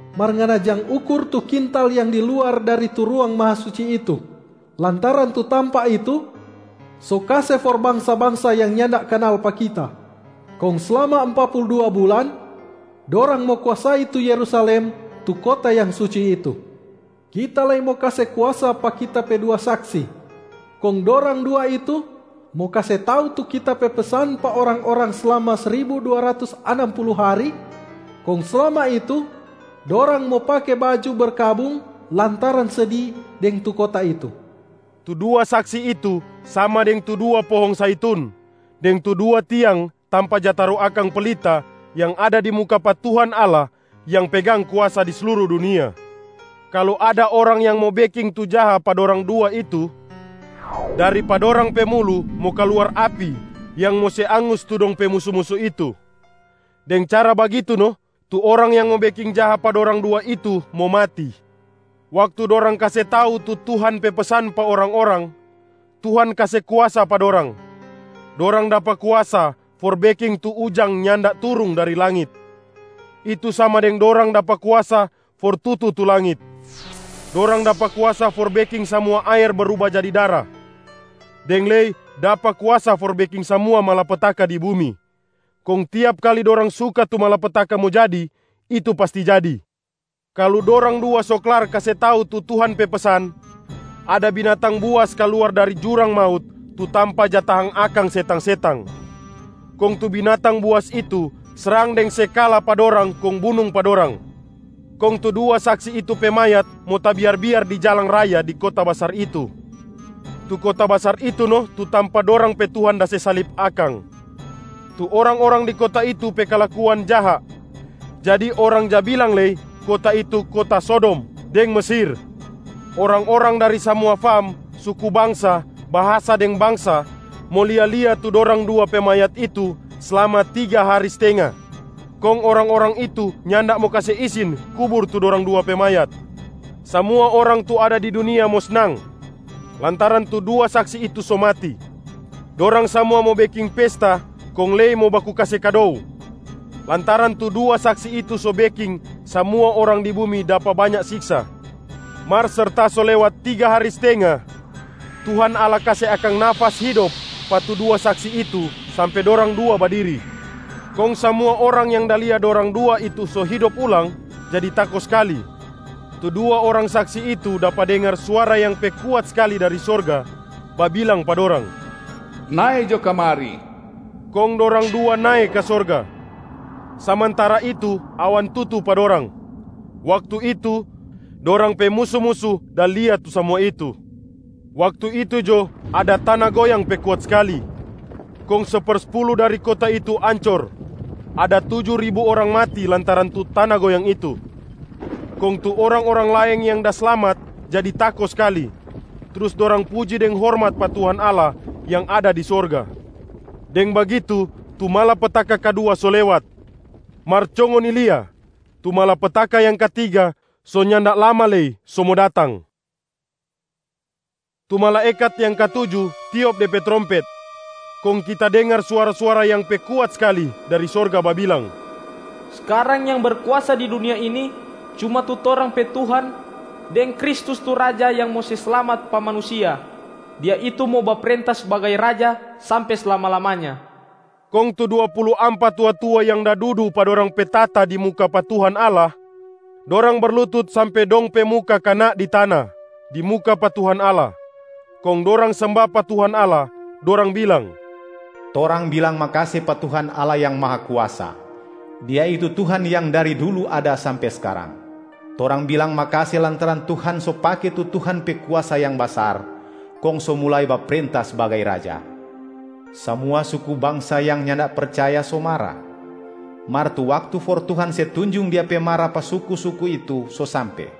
Mar ngana jang ukur tu kintal yang di luar dari tu Ruang Mahasuci itu, lantaran tu tampa itu so kase for bangsa-bangsa yang nyanda kanal pa Kita. Kong slama ampa pulu dua bulan, dorang mo kuasai tu Yerusalem tu kota yang suci itu. Kita lei mo kase kuasa pa Kita pe dua saksi, kong dorang dua itu mo kase tau tu Kita pe pesan pa orang-orang slama sribu dua ratus anam pulu hari, kong slama itu dorang mo pake baju berkabung lantaran sedi deng tu kota itu.” Tu dua saksi itu sama deng tu dua pohong zaitun deng tu dua tiang tampa ja taru akang pelita yang ada di muka pa Tuhan Allah yang pegang kuasa di sluru dunia. Kalu ada orang yang mo beking tu jaha pa dorang dua itu, dari pa dorang pe mulu mo kaluar api yang mo se angus tu dong pe musu-musu itu. Deng cara bagitu no tu orang yang mo beking jaha pa dorang dua itu mo mati. Waktu dorang kase tau tu Tuhan pe pesan pa orang-orang, Tuhan kase kuasa pa dorang. Dorang dapa kuasa for beking tu ujang nyanda turung dari langit, itu sama deng dorang dapa kuasa for tutu tu langit. Dorang dapa kuasa for beking samua aer bruba jadi dara, deng lei dapa kuasa for beking samua malapetaka di bumi. Kong tiap kali dorang suka tu malapetaka mo jadi, itu pasti jadi. Kalu dorang dua so klar kase tau tu Tuhan pe pesan, ada binatang buas kaluar dari jurang maut tu tampa ja tahang akang setang-setang. Kong tu binatang buas itu srang deng se kala pa dorang kong bunung pa dorang. Kong tu dua saksi itu pe mayat mo tabiar-biar di jalang raya di kota basar itu. Tu kota basar itu no tu tampa dorang pe Tuhan da se salib akang. Tu orang-orang di kota itu pe kalakuan jaha, jadi orang ja bilang lei kota itu kota Sodom deng Mesir. Orang-orang dari samua fam, suku bangsa, bahasa deng bangsa mo lia-lia tu dorang dua pe mayat itu slama tiga hari stenga. Kong orang-orang itu nyanda mo kase isin kubur tu dorang dua pe mayat. Samua orang tu ada di dunia mo snang lantaran tu dua saksi itu so mati. Dorang samua mo beking pesta kong lei baku kase kado, lantaran tu dua saksi itu so beking samua orang di bumi dapa banya siksa. Mar serta so lewat tiga hari stenga, Tuhan Allah kase akang nafas hidop pa tu dua saksi itu sampe dorang dua badiri. Kong samua orang yang da lia dorang dua itu so hidop ulang jadi tako skali. Tu dua orang saksi itu dapa dengar suara yang pe kuat skali dari sorga babilang pa dorang, “Nae jo kamari!” Kong dorang dua nae ka sorga, samantara itu awan tutu pa dorang. Waktu itu, dorang pe musu-musu da lia tu samua itu. Waktu itu jo ada tana goyang pe kuat skali kong sepersepulu dari kota itu ancor. Ada tuju ribu orang mati lantaran tu tana goyang itu, kong tu orang-orang laeng yang da slamat jadi tako skali, trus dorang puji deng hormat pa Tuhan Allah yang ada di sorga. Deng bagitu tu malapetaka kadua so lewat. Mar co ngoni lia, tu malapetaka yang katiga so nyanda lama lei so mo datang. Tu malaekat yang katuju tiop de pe trompet, kong kita dengar suara-suara yang pe kuat skali dari sorga babilang, “Skarang yang berkuasa di dunia ini, cuma tu torang pe Tuhan deng Kristus tu Raja yang mo se slamat pa manusia. Dia itu mo baprenta sbagai Raja sampe slama-lamanya.” Kong tu dua pulu ampa tua-tua yang da dudu pa dorang pe tahta di muka pa Tuhan Allah, dorang berlutut sampe dong pe muka kana di tana di muka pa Tuhan Allah, kong dorang semba pa Tuhan Allah. Dorang bilang, “Torang bilang makase pa Tuhan Allah Yang Mahakuasa! Dia itu Tuhan yang dari dulu ada sampe skarang. Torang bilang makase lantaran Tuhan so pake tu Tuhan pe kuasa yang basar, kong so mulai baprenta sbagai Raja. Samua suku bangsa yang nyanda percaya so mara, mar tu waktu for Tuhan se tunjung Dia pe mara pa tu suku-suku itu so sampe,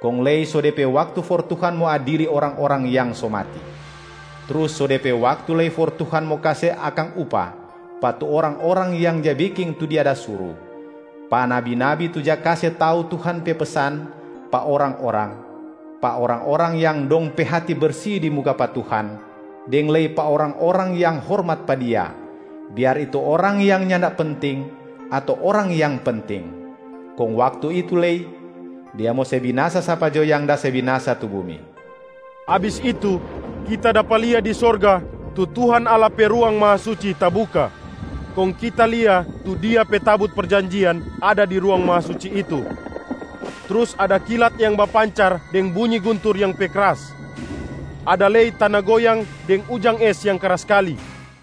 kong lei so de pe waktu for Tuhan mo adili orang-orang yang so mati. Trus so de pe waktu lei for Tuhan mo kase akang upah: pa tu orang-orang yang ja beking tu Dia da suru, pa nabi-nabi tu ja kase tau Tuhan pe pesan pa orang-orang, pa orang-orang yang dong pe hati bersi di muka pa Tuhan, deng lei pa orang-orang yang hormat pa Dia, biar itu orang yang nyanda penting ato orang yang penting. Kong waktu itu lei, Dia mo se binasa sapa jo yang da se binasa tu bumi.” Abis itu, kita dapa lia di sorga tu Tuhan Allah pe Ruang Mahasuci tabuka, kong kita lia tu Dia pe tabut perjanjian ada di Ruang Mahasuci itu. Trus ada kilat yang bapancar deng bunyi guntur yang pe kras, ada lei tana goyang deng ujang es yang kras skali.